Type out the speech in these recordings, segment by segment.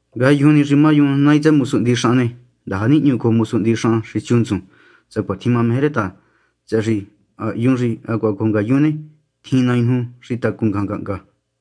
Ngayujun ni xi má yun nai tsëhë mosu hndixahan ne, ndaja nihñu cojo mosu hndixahan xi siu ntsun, sacuatjin mameje rë ta, tsëhë xi ha hyun xi hacuaha cojo ngayun ne, tjin nai nuju xi tacun ngajan ngahnga.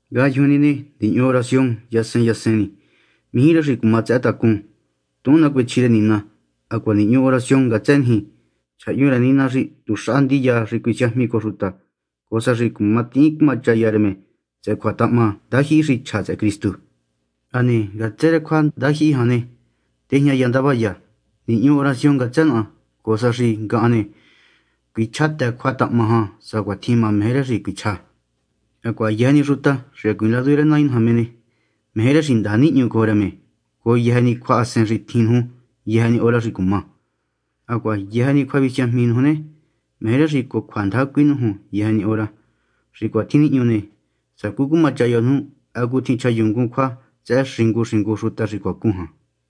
Ngayujun ni ne, nihñu oración yasen yasen ni. Mijí rë xi cuma tsëhë́ tacún. Tuhun nacuechji rë Nina. Hacuaha nihñu oración ngatsë niji. Chjahyun rë Nina xi tuxaha ndiya xi cuisiajmi cojo xuta, cojo sa xi cuma tihín cumachaya rë me tsëhë cjuatahahma ndajyihi xi chja tsëhë Cristu. Hane ngatsë rë cjuandajyihi jan ne, tejñaya ndavaya. Nihñu oración ngatsë naha, cojo sa xi ngahan ne, cuichjátë cjuatahahma jan, sacuatjin meje rë xi cuichjá. Hacuaha yëjë ni xuta xi hacuiin ladu rë Nai naja me ne, meje rë xi ndaja nihñu cojo rë me cojo yëjë ni cjuahasen xi tjin nuju, yëjë ni hora xi cuma. Hacuaha yëjë ni cjuavisiajmi nuju ne, meje rë xi cojo cjuandaja cuinújun yëjë ni hora. Xi cuatjin nihñu ne, sacú cumachaya nuju hacutjin chjayunngun cjua tsëhë xingu xingu xuta xi cuacun jan.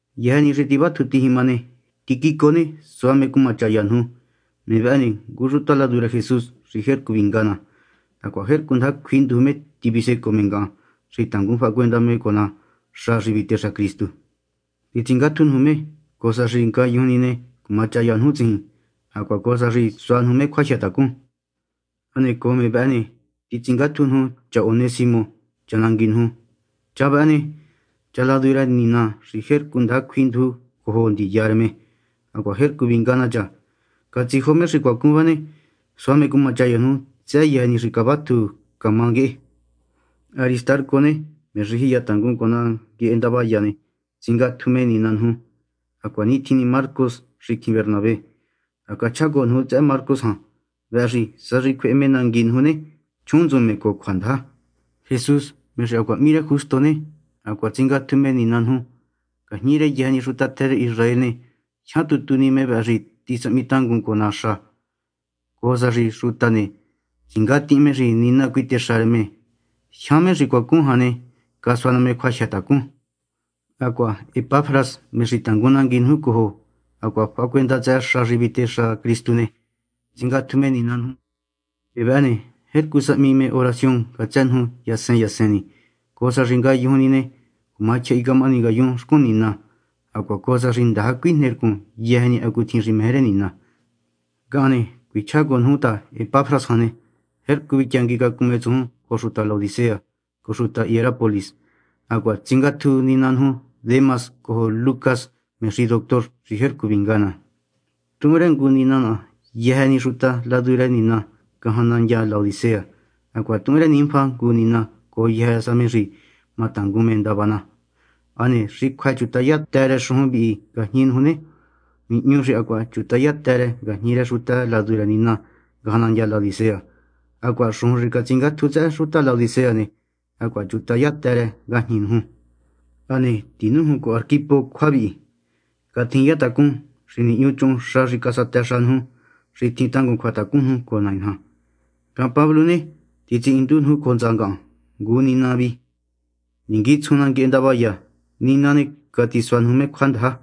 Yëjë ni xi tivátju tijima ne, Tíquico ne, sua me cumachaya nuju. Me vëhë ne, ngu xuta ladu rë Jesús xi jercu vinga ná, hacuaha jercu ndaja cjuinduju me tivisecoo me ngahan xi tangun fahacuenda me cojo ná xa xi vitexa Cristu. Titsingátju nuju me, cojo sa xi ngayujun ni ne, cumachaya nuju tsijin hacuaha cojo sa xi sua nuju me cjuajyëtacun. Hane cojo me vëhë ne, titsingátju nuju cha Onésimo, cha nangui nuju. Cha vëhë ne, cha ladu rë Nina xi jercu ndaja cjuinduju cha cojo ndiya rë me, hacuaha jercu vinga ná cha. Catsijo me xi cuacun vë ne, sua me cumachaya nuju tsëhë yëjë ni xi cavatju nguehe camá. Aristarco ne, me xi jiyatangun cojo ná nguehe ndavaya ne, tsingatju me nina nuju. Hacuanitjin ni Marcos, xicjin Bernabé. Ha cachjá cojo nuju tsëhë Marcos jan. Vëhë xi sa xi cjuehe me nangui nuju ne, chjuhunntsun me cojo cjuandaja. Jesús, me xi hacuaha hmí rë Justo ne, hacuaha tsingatju me nina nuju. Ngajñi rë yëjë ni xuta tjë rë Israel ne, jyan tu tu ni me vëhë xi tisahmitangun cojo ná xa, cojo sa xi xuta ne, tsingatihin me xi Nina cuitexa rë me. Jyan me xi cuacun jan ne, casua ná me cjuajyëtacun. Hacuaha Epafras, me xi tangun nangui nuju cojo hacuaha fahacuenda tsëhë xa xi vitexa Cristu ne, tsingatju me nina nuju. Me vëhë ne, jercu sahmi me oración ngatsë nuju yasen yasen ni, cojo sa xi ngayujun ni ne, cuma tyjahi camahani ngayun xcun Nina, hacuaha cojo sa xi ndaja cuijnercun yëjë ni hacutjin xi meje rë Nina. Ngahan ne, cuichjá cojo nuju ta Epafras jan ne, jercu vityanguicacun me tsujun cojo xuta Laodicea cojo xuta Hierápolis. Hacuaha tsingatju nina nuju Demas cojo Lucas, me xi doctor xi jercu vinga ná. Tuhun rë ngu nina yëjë ni xuta ladu rë Nina ngajan nandya Laodicea. Hacuaha tuhun rë Ninfa ngu nina cojo yëjë sa me xi matangun me ndava na. Hane xi cjuë chutahaya të rë xujun vi ngajñi nuju ne, nihñu xi hacuaha catichutahaya të rë ngajñi rë xuta ladu rë Nina ngajan nandya Laodicea. Hacuaha xujun xi catsingátju tsëhë xuta Laodicea ne, hacuaha chutahayun të ngajñi nuju. Hane tinújun cojo Arquipo cjua vihi: “Catjiniya tacún xi nihñuchuhun xa xi casatëxa nuju, xi tjin tangun cjuatacun nuju cojo Nai naja.” nina vi. Ngahan, Pablo ne, titsihindu nuju cojo hntsa ngahan ngu nina vi. Ninguitsjun ná nguehe ndavaya. Nina ne, catisua nuju me cjuandaja.